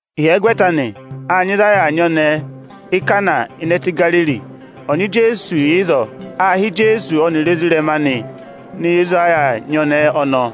Ịhyẹgwẹta anị, â nyị ịzị a yà aa nyị ọnẹẹ Íkana ịnị ẹtẹ Igariri. Ọnyị Ijeesu yà ịzọọ Â hị́ Ijeesu ọnịrị ezirẹma anị nọ ịzị a yà aa nyị ọnẹẹ aanị.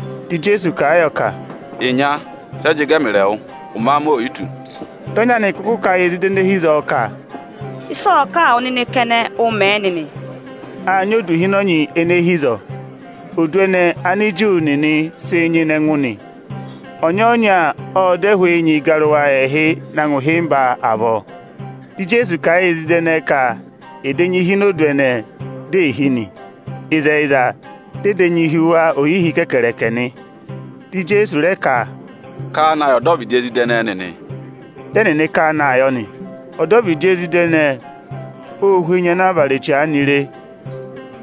Dị Ijeesu kà a yọ ka, “Ịnya, sẹ jị gẹ ẹmịrị ẹwụ? Ụmẹ amị o yi tù.” Dị ọnyị anị kụkụ kà a yị ezida ene hi ịzọọ ka, “Ịsị ọ̀ọ kà wụ nịnị kẹnẹ, ụ mẹ̀ ẹ nịnị!” Â nyị odu ịhịnọnyị ene hi ịzọọ. Odu ẹnẹẹ Aniju nịnịị̄ sịị nyịna ẹngụ nị. Ọnya-ọnya ộ dọ ẹhụụ enyi ịgarụwa ẹẹhị na ngụ ịhịmba avọọ. Dị Ijeesu kà a yị ezida ẹnẹẹ ka ẹ̀ dà enyi hi ini odu ẹnẹẹ, di è hí nị. Ịzẹyịza, dị ẹ dà enyi hi wa ohihi kẹkẹrẹkẹẹ nị. Dị Ijeesu rẹ ka, “Ká a na yị ohi aga ana ya ịzọọ!” Dị ẹnịnị ká a naa yọ nị. Ohi aga ọnọọ ô hú enyi ana a vara eche aanị;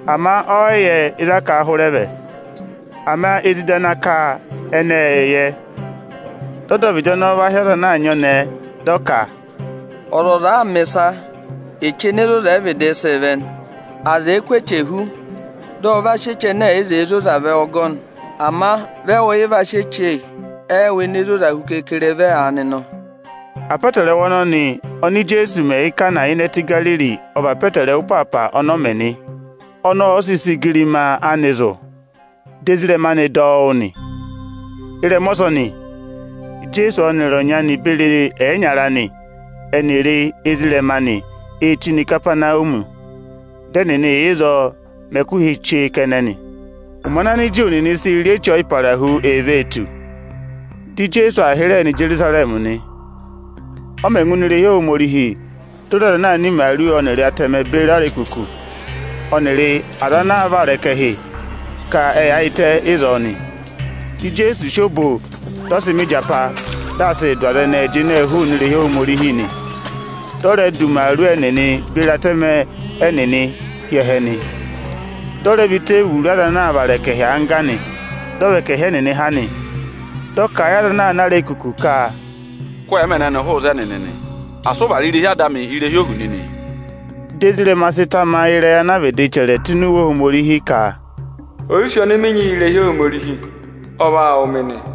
ama ọ yị yẹ ịzị a sị ọ hụrẹ vẹ. Ama ezida ana ká a kẹnẹ ệ yẹ nị. Dị ohi aga ọnọọ va hị́ ọza ana aa nyị ọnẹẹ, dị ọ ka, “Ọzọza àa mẹ̀ ịsa, eche ene zoza hu ẹ vịdịị sịị vẹ nị. Aza èe kụ́ eche hú, dị ọ va sị eche ẹnẹ ẹ̀ yị zẹẹ zoza vẹ ọgọnị. Ama vị ẹwụ yịị va sị eche ene zoza hu keekere vẹ aanị nọ!” Apọtẹrẹwa ọnọnị oni Ijeesu mẹ Íkana ịnị ẹtẹ Igariri ọ vị apọtẹrẹwa ịpaapa ọnọọ mẹ nị. Ọnị ọ sị sị igirima anị zụ̀, dị ezirẹma anị dọ ọ wụ́ nị. Ịrẹma ọsọnị, Ijeesu ọnịrị ọnyị anị beri ẹyịnyara anị ẹnịrị ezirẹma anị ê chí nọ Ikapanawumi. Dị ẹnịnị yà ịzọọ mẹ ẹkụhị chee kẹnẹ nị. Ụmẹ ana Aniju nịnị sịị̄ rị Eche Ọyịparahu ee vee tù, dị Ijeesu aa hịrẹẹ nọ Ijerusarẹmị nị. Ọ mẹ̀ ngụ ini irehi Ohomorihi, di o re aza ana aa ná imaaru ọnịrị atẹmẹ beri arekuku, ọnịrị aza ana aa vara ẹkẹhị ka ẹ yaayịtẹ ịzọọ nị. Dị Ijeesu sị obo, dị ọ sị mẹ ịjapa, dị aa sịị dụ aza ẹnẹẹ jịnẹẹ hụụnị irehi Ohomorihi nị. Dị ọ rẹ dụ imaaru ẹnịnị beri atẹmẹ ẹnịnị hi ẹhẹ nị. Dị ọ rẹ và iteevuru aza ana aa vara ẹkẹhị angga, dị ọ và ẹkẹhị ẹnịnị ha nị. Ộ kà a yị aza ana aa ná arekuku ka, “Kụ́ ẹẹmẹ ẹnẹnị hụụ ịzẹnị nịnị! Asị ụ vara irehi Ada amị ohu nịnị!” Dị ezirẹma anị sị tamayị ịrẹyị ana a vịdị chẹrẹ tụ́ ini Iwe Ohomorihi ka, “Oyisì ọnị mị nyị yị irehi Ohomorihi, ọ vaa wụ̀ mị nị.”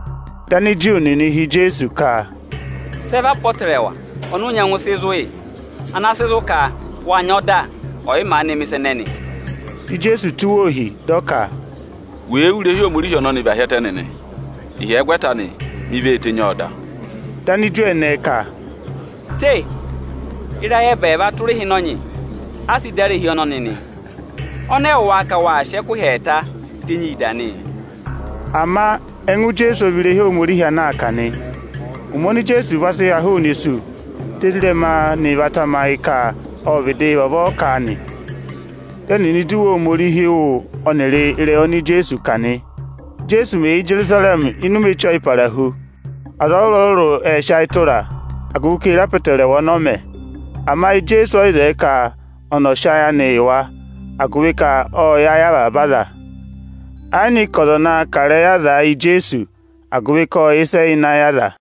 Dị Aniju nịnị họ̀ Ijeesu ka, “Sị ẹ vị apọtẹrẹwa ọnị ụ nyẹngụ sị zụ̀ yị, ana sị zụ̀ ka wâ nyị ọda ọyị maanị mẹ̀ ịsa ẹnẹnị?” Dị Ijeesu tụ́ wa ohi, dị ọ ka, “Wèe wú irehi Ohomorihi ọnọnị và hi ẹtẹ nịnị, ịhyẹgwẹta anị, mi vee tenyi ọọ dà.” Dị Aniju ẹnẹẹ ka, “Te! Ịrayị ẹbẹẹva tụra ịhịnọnyị a sị dà irehi ọnọnị nị; ọnị ẹwụ wáá ka waa sị ẹkụhị ẹẹtaa tenyii dà nị?” Ama ẹngụ Ijeesu ọ vị irehi Ohomorihi ana aa kà nị. Ụmẹ oni Ijeesu va sị ha hụụnị isu, dị ezirẹma anị va tamayị ka ọ́ vịdị vavọọ kà nị. Dị ẹnịnị dọ Iwe Ohomorihi wụ́ ọnịrị ịrẹyị oni Ijeesu kà nị. Íjeesu mẹ̀ yà Ijerusarẹmị ịnị ụmẹ Eche Ọyịparahu, aza ọrụrụ-ọrụrụ ệ sị ayị tụra a, agụvị ka ê re apọtẹrẹwa ọnị ọ mẹ. Ama Ijeesu ọ yị sị ayị tụra wa, agụvị ka ộ yẹ ayị avaba aza. Ẹ yị nyị ka ọza ọ̀ naa kà ịrẹyị azaa yị Ijeesu, agụvị ka ộ yẹ ịsị ẹ yà ịnị ayị aza.